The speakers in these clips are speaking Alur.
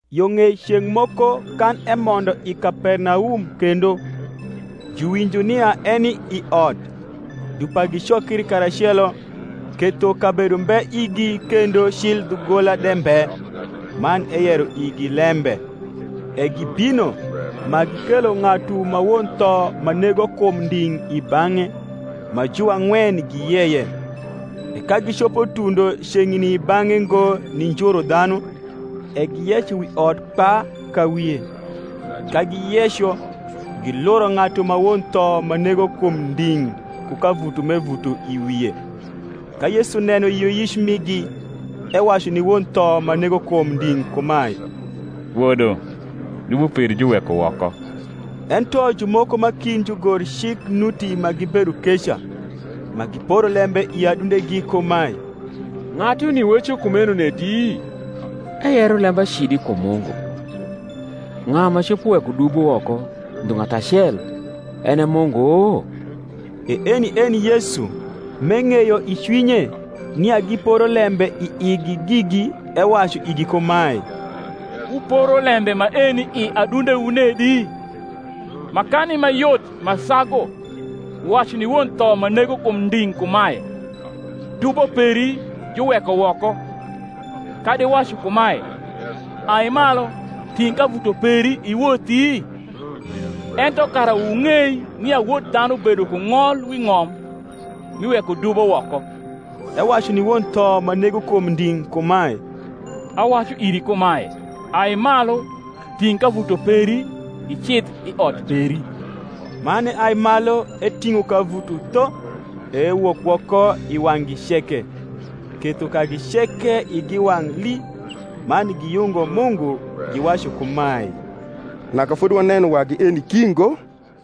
Yo ng’ei ceng’ moko kan emondo i Kapernaum kendo, juwinjo nia eni i ot. Dupa gicokri karacelo, ketho kabedo mbe igi kendo cil dhugola de mbe: man eyero igi lembe. E gibino, ma gikelo ng’atu ma won tho ma nego kum nding’ i bang’e, ma juang’wen giyeye. E ka gicopo tundo ceng’ni i bang’e ngo ni njuru dhanu, e giyeco wi ot kpa ka wie: ka giyeco, giluro ng’atu ma won tho ma nego kum nding’ ku kavuto m’evuto i wie. Ka Yesu neno yioyic migi ewacu ni won tho ma nego kum nding’ kumae, Wodo, dubo peri juweko woko. Ento jumoko ma kind jugorcik nuti ma gibedo keca, ma giporo lembe i adundegi kumae, Ng’atuni weco kumeno nedi? eyero lembacidi kum Mungu: ng’a ma copo weko dubo woko ndhu ng’atu acel, en e Mungu? E eni eni Yesu, m’eng’eyo i cwinye nia giporo lembe i igi gigi, ewacu igi kumae, Wuporo lembe maeni i adundewu nedi? Makani ma yot ma sagu, wacu ni won tho ma nego kum nding’ kumae, Dubo peri juweko woko; kadi wacu kumae, Ai malu, ting’ kavuto peri iwothi? Ento kara wung’ei nia Wod dhanu bedo ku ng’ol wi ng’om mi wekodubo woko (ewacu ni won tho ma nego kum nding’ kumae), Awacu iri kumae, Ai malu ting’ kavuto peri, icidh i ot peri. Man eai malu, eting’o kavuto tho, e ewok woko i wang’gi ceke; ketho kagi ceke igi wang’ lii, man giyungo Mungu, giwacu kumae, Naka fodi waneno wagi eni ki ngo.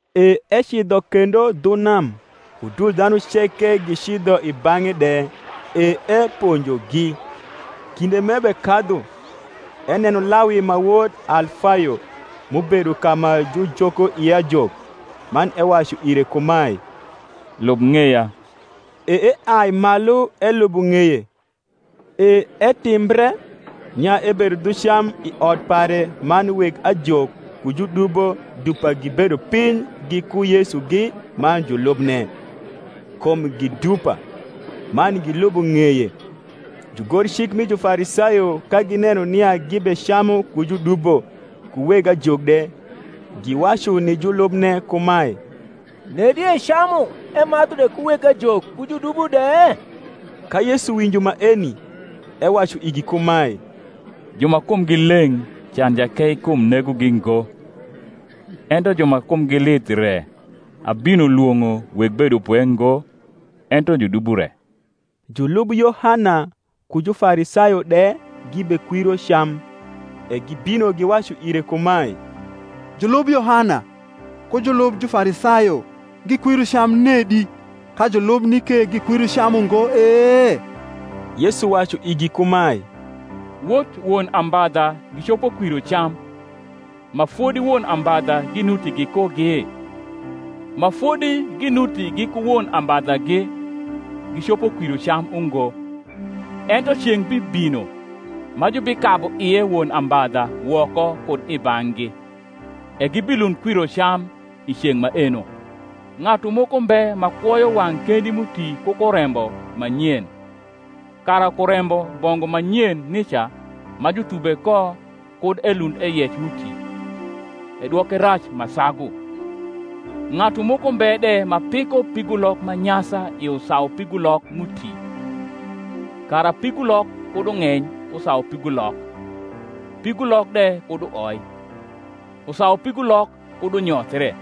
E ecidho kendo dhu nam; udul dhanu ceke gicidho i bang’e de, e eponjogi. Kinde m’ebekadhu, eneno Lawi ma wod Alfayo m’ubedo ka ma jujoko ie ajok, man ewacu ire kumae, Lub ng’eya. E eai malu elubo ng’eye. E etimbre, nia ebedo dhu cam i ot pare man weg ajok ku judubo dupa gibedo piny giku Yesugi man julubne: kum gi dupa, man gilubo ng’eye. Jugorcik mi Jufarisayo ka gineno nia gibecamu ku judubo ku weg ajok de, giwacu ni julubne kumae, Nedi ecamu emadhu de ku weg ajok ku judubo de? Ka Yesu winjo maeni, ewacu igi kumae, Ju ma kumgi leng’ can jakeikum negogi ngo, ento ju ma kumgi lith re: abino lwong’o weg bedopwe ngo, ento judubo re. Julub Yohana ku Jufarisayo de gibekwiro cam: e gibino giwacu ire kumae, Julub Yohana ku julub Jufarisayo gikwiro cam nedi, ka julubni ke gikwiro cam ungo e? Yesu wacu igi kumae, Wot won ambadha gicopo kwiro cam, ma fodi won ambadha ginuti gikugi? ma fodi ginuti giku won ambadhagi, gicopo kwiro cam ungo. Ento ceng’ bibino, ma jubikabu ie won ambadha woko kud i bang’gi, e gibilund kwiro cam i ceng’ maeno. Ng’atu moko mbe ma kwoyo wang’ kendi m’uti ku kurembo ma nyen: kara kurembo bongu ma nyen nica ma juthube ko kud elund eyec m’uti, edwoke rac ma sagu. Ng’atu moko mbe de ma piko pigulok ma nyasa i usaupigulok m’uti; kara pigulok kud ung’eny usaupigulok, pigulok de kud uoi, usaupigulok kud unyothre: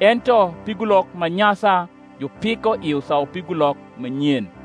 ento pigulok ma nyasa jupiko i usaupigulok ma nyen.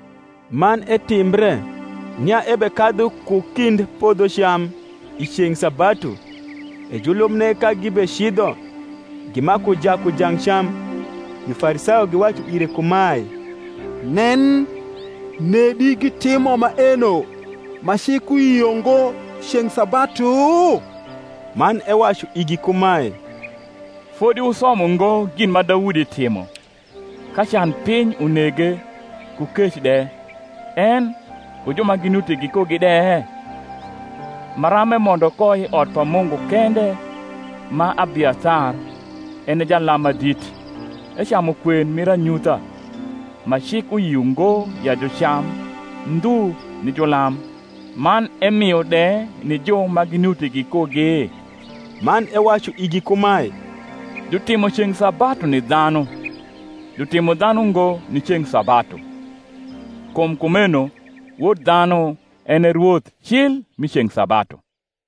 Man etimbre, nia ebekadhu ku kind podhocam i ceng’ sabatu; e julubne, ka gibecidho, gimaku jaku jang cam. Jufarisayo giwacu ire kumae, Nen, nedi gitimo maeno ma cik uyio ngo ceng’ sabatu? Man ewacu igi kumae, Fodi wusomo ngo gin ma Daudi timo, ka canpiny unege, ku kec de, en, ku ju ma ginuti gikugi de? Maram emondo ko i ot pa Mungu kende ma Abiathar en e jalam ma dit, ecamu kwen mir anyutha, ma cik uyio ngo ya jucam ndhu ni julam, man emio de ni ju ma ginuti gikugi? Man ewacu igi kumae, Jutimo ceng’ sabatu ni dhianu, jutimo dhanu ngo ni ceng’ sabatu: kum kumeno Wod dhanu en e rwoth cil mi ceng’ sabatu.